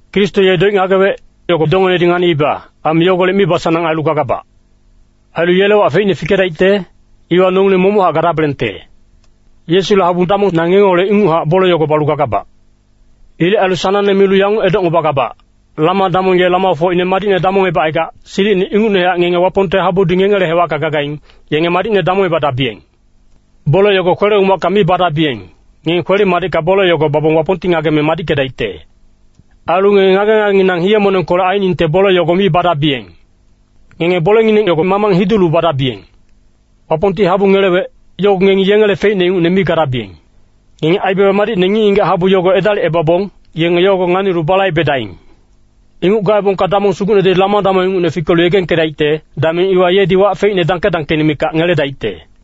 Kristo ye doic ngagewec, yogo dongenedi nganiiba. Aime yogolec mibasanang ailu gagabac. Ailu yele wac feicne fikedaicte, iwa nongileng momochac gadabelengte. Yesule habu damong, na ngengeholec inguchac bole yogo balu gagabac. Ilec ailu sanangne milu yanguc edocngebagabac, Lama-damong ye lamafocine madicne damongebacaigac, silicine ingucnehac ngenge Wapongte habudi ngengele hewacka gagaing, yenge madicne damongebadabiyeng. Bole yogo kwele-umacka mi badabiyeng, ngenge kwele-madicka bole yogo babong Wapongti ngageme madickedaicte. Ailu ngenge ngage-ngagenginang hiye-monengkolec ainingte bole yogo mi badabiyeng. Ngenge bolengineng yogo mamang hidulu badabiyeng. Wapongti habu ngelewec, yogo ngengi yengele feicne ingucne mi gadabiyeng. Ngenge aibaba madicne ngic-ngigac habu yogo edalicebabong, yenge yogo nganilu balaibedaing. Inguc gaebongka Damong Sugucnedi lama-damong ingucne fikelu yegengkedaicte, dameng iwa yedi wac feicne dangke-dangkeine mikac ngeledaicte.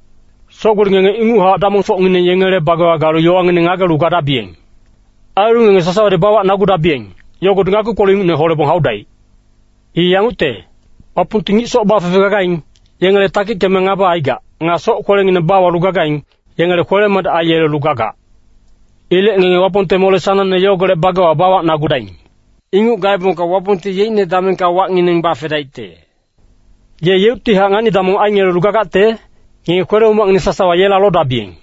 Soc-gboli ngenge inguchac damongfocngineng yengele bagewa galu yowangineng ngagelu gadabiyeng. Ailu ngenge sasawadi bawacnagudabiyeng, yogodi ngakpi-kpoluc ingucne holebong haudaic. I yangucte, “Wapongti ngic soc bafefe gagaing, yengele takickeme ngaba aigac. Nga soc-kwelengineng bawalu gagaing, yenge kwele-madic aiyelelu gagac.” Ilec ngenge Wapongte mole sanangne yogolec bagewa bawacnagudaing. Inguc gaebongka Wapongti yeicne damengka wacngineng bafedaicte. Ye yeuctihac ngani-damong aingelelu gagacte, ngenge kwele-umacngineng sasawa yela lodabiyeng.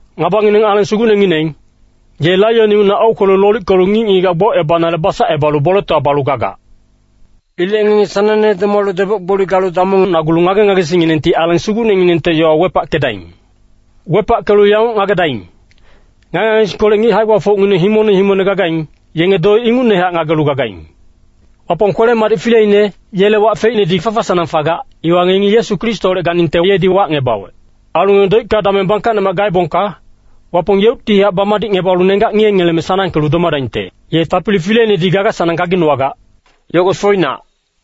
Ngabangineng Aleng Sugucnengineng, ye laion ingucne aukwelu lolickelu ngic-ngigac gbocebanale basacebalu boletowa balu gagac. Ilec ngenge sanangne domalu deboc-gboli galu damongnagulu ngage-ngagesingnginengti Aleng Sugucnenginengte yowa wepackedaing. Wepackelu yanguc ngagedaing, ngage-ngagesingkolec ngic hae-gbafocngineng himongne himongne gagaing, yenge doic ingucnehac ngagelu gagaing. Wapong kwele-madic fileine, yele wac feicnedi fafa-sanang fagac, iwa ngengi Yesu Kristoholec ganingte yedi wacngebawec. Ailu ngenge doicka dameng bangkacnemac gaebongka, Wapong yeuctihac bamadicngebalu nenggac ngiyengeleme sanangkelu domadaingte. Ye Tapili fileinedi gaga-sanang gaginowagac, yogo foinac.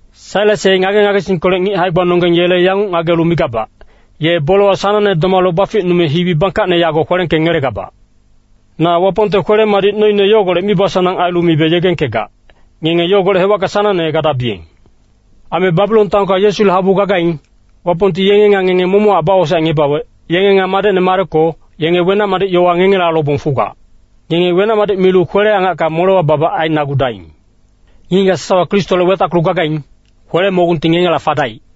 Sailas ye ngage-ngagesingkolec ngic hae-gbanonggeng yele yanguc ngagelu migabac, ye bolewa sanangne domalu baficnume hibi bangkacne yago kwelengkengelegabac. Na Wapongte kwele-madic noine yogolec mibasanang ailu mibe yegengkegac, ngenge yogolec hewacka sanangne gadabiyeng. Aime Babilon taonka Yesule habu gagaing, Wapongti yenge nga ngenge momochac bawosaecngebawec, yenge nga madecne Mareko, yenge wenac-madic yowa ngengela lobong fugac. Ngenge wenac-madic milu kwele-angacka molewa babac ainagudaing. Ngic-ngigac sasawa Kristoholec wetackelu gagaing, kwele-mogungti ngengela fadaic.